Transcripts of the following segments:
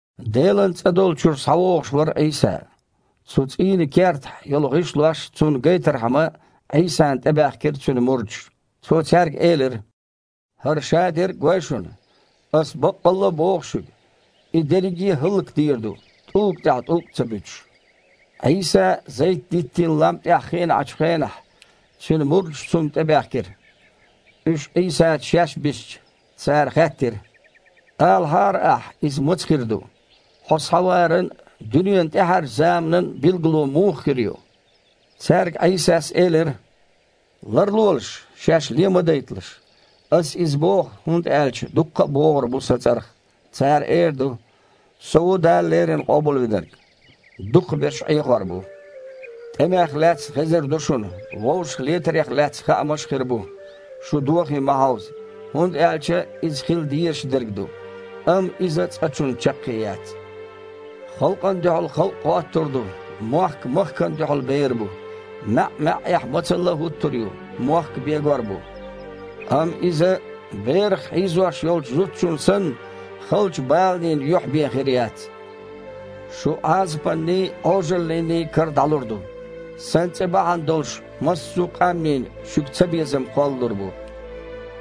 Делан цІа долчуьра схьавогІуш вара Іийса. Цу цІийнан кертахь йолу гІишлош Цунна гайтархьама, Іийсана тІебаьхкира Цуьнан мурдаш. Цо цаьрга элира: «ХІара шадерг а гой шуна? Аса баккъалла а боху шуьга: И дерриге а хІаллакдийр ду, тІулга тІехь тІулг а ца буьтуш». Іийса Зайт-диттийн лам тІехь хиъна Іачу хенахь, Цуьнан мурдаш Цунна тІебаьхкира. Уьш Іийсаца шаьш бисча, цара хаьттира: «Алахьара Ахьа, иза маца хир ду? Хьо схьаваран а, дуьненан тІаьхьарчу заманан а билгало муха хир ю?» Цаьрга Іийсас элира: «Ларлолаш, шаьш ле ма дайталаш. Аса иза боху, хІунда аьлча дуккха а богІур бу Сан цІарах. Цара эр ду: „Со ву Дала леррина Къобалвинарг!“ Дукхахберш Іехор бу. ТІемех лаьцна хезар ду шуна, вовшахлетарех лаьцна хаамаш а хир бу. Шу дохий ма хьовза, хІунда аьлча иза хила дезаш дерг ду. Амма иза цкъачунна чаккхе яц. Халкъана дуьхьал халкъ гІоттур ду, мохк махкана дуьхьал бер бу. МаьІ-маьІІехь мацалла а хІуттур ю, мохк а бегор бу. Амма иза, берах хьийзош йолчу зудчун санна, халчу баланийн юьхь бен хир яц. Шу Іазапанний, Іожаллиний кара дІалур ду. Сан цІе бахьана долуш массо а къаьмнийн шуьга цабезам кхоллалур бу.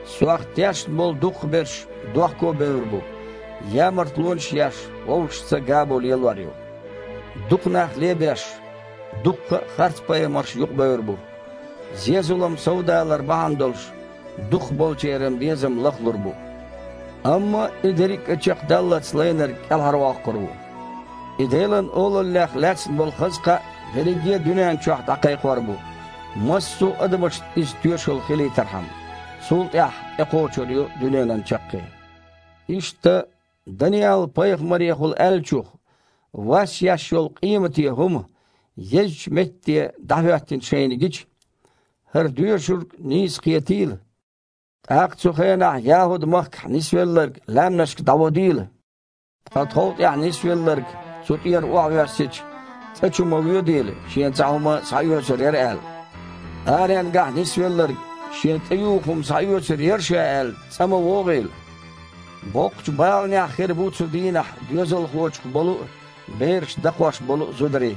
Сох тешна болу дукхахберш дохко а бевр бу, ямартлонаш а еш, вовшашца гамо лелор ю. Дукха нах лебеш, дуккха а харцпайхамарш юкъабевр бу. Зен-зулам совдалар бахьана долуш, дукхахболчеран безам лахлур бу. Амма и дерриг а чекхдаллалц лайнарг кІелхьарвоккхур ву. И Делан Олаллех лаьцна болу хаза кхаъ дерриге а дуьнен чохь дІакхайкхор бу, массо а адамашна иза тоьшалла хилийтархьама. Цул тІаьхьа тІекхочур ю дуьненан чаккхе». «Иштта, Даниал-пайхамарехула аьллачух „вас еш йолу къемате хІума“ езачу метте дІахІоьттина шайна гича, – (хІара доьшург нийса кхетийла!), тІаккха цу хенахь ЯхІуд-махкахь нисвелларг лаьмнашка дІаводийла. Ткъа тхов тІехь нисвелларг, цу тІера охьавоьссича, цІа чу ма воьдийла, шен цхьа хІума схьаоьцур яра аьлла. Аренгахь нисвелларг, шен тІеюху хІума схьаоьцур яра ша аьлла, цІа ма вогІийла. Боккхачу баланехь хир бу цу дийнахь доьзалхочух болу а, бераш дакхош болу а зударий.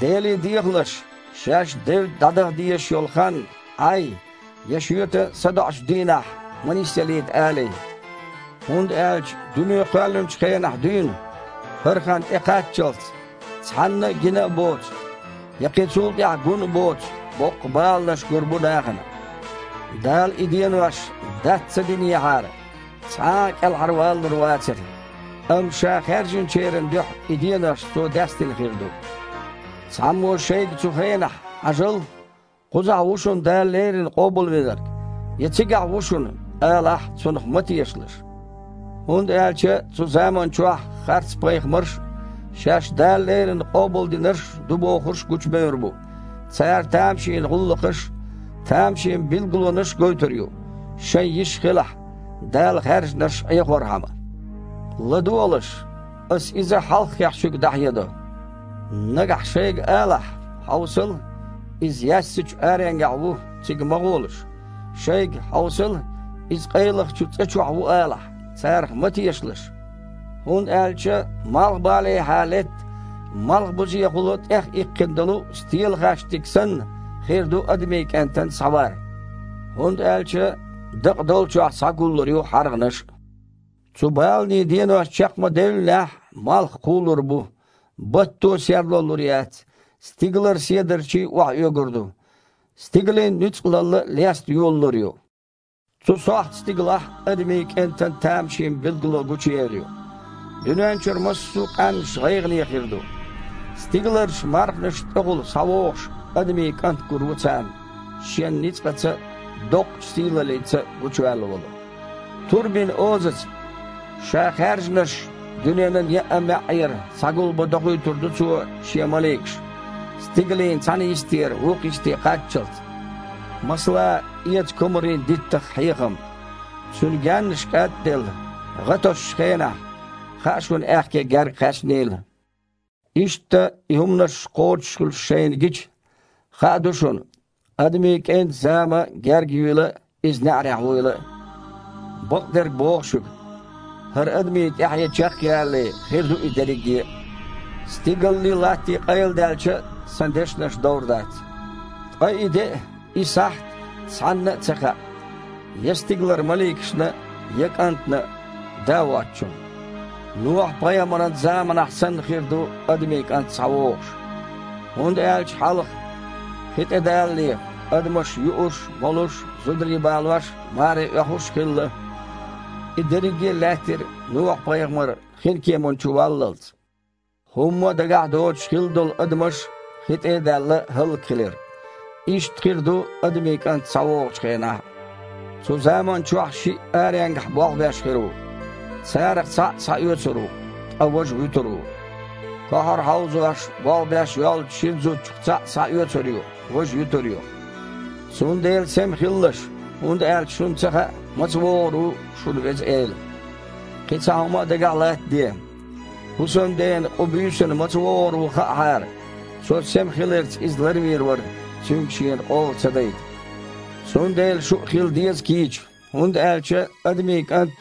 Деле дехалаш, шаьш девдда дІадаха дезаш йолу хан Іай я шоьтан садоІучу дийнахь ма нисъялийта алий. ХІунда аьлча дуьне кхоьллинчу хенахь дуьйна, хІара хан тІекхаччалц, цхьанна а гина а боцу, я кхин цул тІаьхьа гун а боцу боккха баланаш гур бу нахана. Дала и денош дац ца динехьара, цхьа а кІелхьарвалалур вацара. Амма Ша хаьржинчеран дуьхьа и денош Цо дацдина хир ду. Цхьаммо шайга цу хенахь „Хьажал! Кхузахь ву шуна Дала леррина Къобалвинарг!“ я „Цигахь ву шуна!“ алахь, цунах ма тешалаш, хІунда аьлча цу заманчохь харцпайхамарш а, шаьш Дала леррина Къобалдинарш ду бохурш а гучубевр бу. Цара тамашийна гІуллакхаш а, тамашийна билгалонаш а гойтур ю, шайн йиш хилахь, Дала хаьржинарш Іехорхьама. ЛадогІалаш! Аса иза хьалххехь шуьга дІахьедо. Нагахь шайга алахь: „Хьовсал! Иза яьссачу аренгахь ву!“ цига ма гІолаш. Шайга: „Хьовсал, Иза къайлахчу цІа чохь ву!“ алахь, царах ма тешалаш, хІунда аьлча, малхбалехьа летта, малхбузехула тІехъиккхина долу стелахаьштиг санна, хир ду Адамийн КІентан схьавар. ХІунда аьлча дакъа долчохь схьагуллур ю хьаргІанаш а». «Цу баланийн денош чекх ма девллинехь, малх кхулур бу, батто а серло лур яц, стигалара седарчий а охьаоьгур ду, стигалийн нуьцкъалалла а леста йолалур ю. Цу сохьта стигалахь Адамийн КІентан тамашийна билгало гучуер ю. Дуьнен чуьра массо а къаьмнаш гІайгІане хир ду. Стигаларчу мархашна тІехула схьавогІуш Адамийн КІант гур ву царна, Шен ницкъаца а, доккхачу сийлаллица а гучуваьлла волу. Турбин озаца Ша хаьржинарш дуьненан еъа а маьІІера схьагулбан дохуьйтур ду Цо Шен маликаш, стигалийн цхьана йистера вукху йисте кхаччалц». «Масала, эца комарийн диттах хьехам: цуьнан гаьннаш кІад а делла, гІа тосучу хенахь, хаьа шуна аьхке герга кхаьчнийла. Иштта, и хІуманаш кхочушхуьлуш шайна гича, хаа ду шуна Адамийн КІентан зама герга юйла а, Иза неІарехь вуйла а. Бакъдерг боху шуьга: хІара адамийн тІаьхье чекхъялале, хир ду и дерриге а. Стигаллий, латтий къайладаьлча а, Сан дешнаш довр дац». «Ткъа и де а, и сахьт а цхьанна а ца хаьа, я стигалара маликашна а, я КІантана а, Да воцучунна. Нохьа-пайхамаран заманахь санна хир ду Адамийн КІант схьавогІуш. ХІунда аьлча хьалха, хи тІедалале, адамаш юуш, молуш, зударий балош, маре оьхуш хилла. И дерриге а лаьттира Нохьа-пайхамар хинкеманна чу валлалц. ХІумма а дагахь доцуш хилла долу адамаш, хи тІе а даьлла, хІаллакьхилира. Иштта хир ду Адамийн КІант схьавогІучу хенахь а. Цу заманчохь шиъ аренгахь болх беш хир ву. Царах цхьаъ схьаоьцур ву, ткъа важа вуьтур ву. Кохьар хьовзош, болх беш йоллучу шина зудчух цхьаъ схьаоьцур ю, важа юьтур ю. Цундела сема хилалаш, хІунда аьлча шуна ца хаьа, маца вогІур ву шун Веза Эла. Кхин цхьа хІума а дагахь латтаде: хІусамдена къу буьйсанна маца вогІур ву хаьахьара, цо сема хиларца иза ларвийр вара, цуьнга шена къола ца дайта. Цундела шу а хила деза кийча, хІунда аьлча Адамийн КІант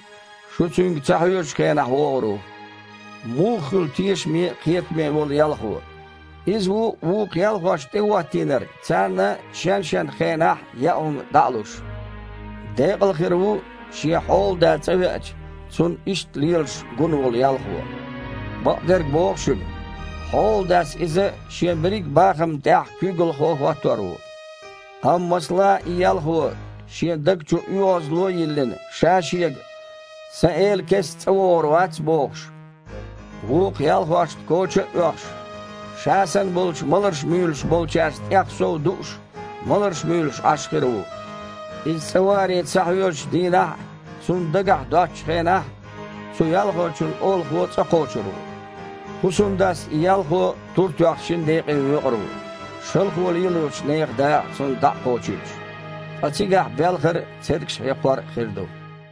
шу Цуьнга ца хьоьжучу хенахь вогІур ву». «Муха хуьлу тешаме а, кхетаме а волу ялхо? Иза ву вукху ялхошна тІехІоттийнарг, царна шен-шен хенахь яа хІума дІа а луш. Декъал хир ву, шен хьолада цІа веача, цунна иштта лелаш гун волу ялхо. Бакъдерг боху шуьга: хьоладас иза шен берриг а бахамна тІехь куьйгалхо хІоттор ву. Амма, масала, и ялхо, шен даг чу оьгІазло а йиллина, ша-шега: „Сан эла кестта цІа вогІур вац“ бохуш, вукху ялхошна коча а оьхуш, ша санна болчу маларш муьйлуш болчаьрца тІех сов дууш, маларш муьйлуш Іаш хир ву. Иза цІа варе ца хьоьжучу дийнахь а, цунна дагахь доцучу хенахь а, цу ялхочун олахо цІа кхочур ву. ХІусамдас и ялхо, тур тоьхна, шина декъе воькъур ву, шалхо лелочу нехан дакъа цунна дІа а кхочуьйтуш. Ткъа цигахь белхар а, цергаш хьекхор а хир ду».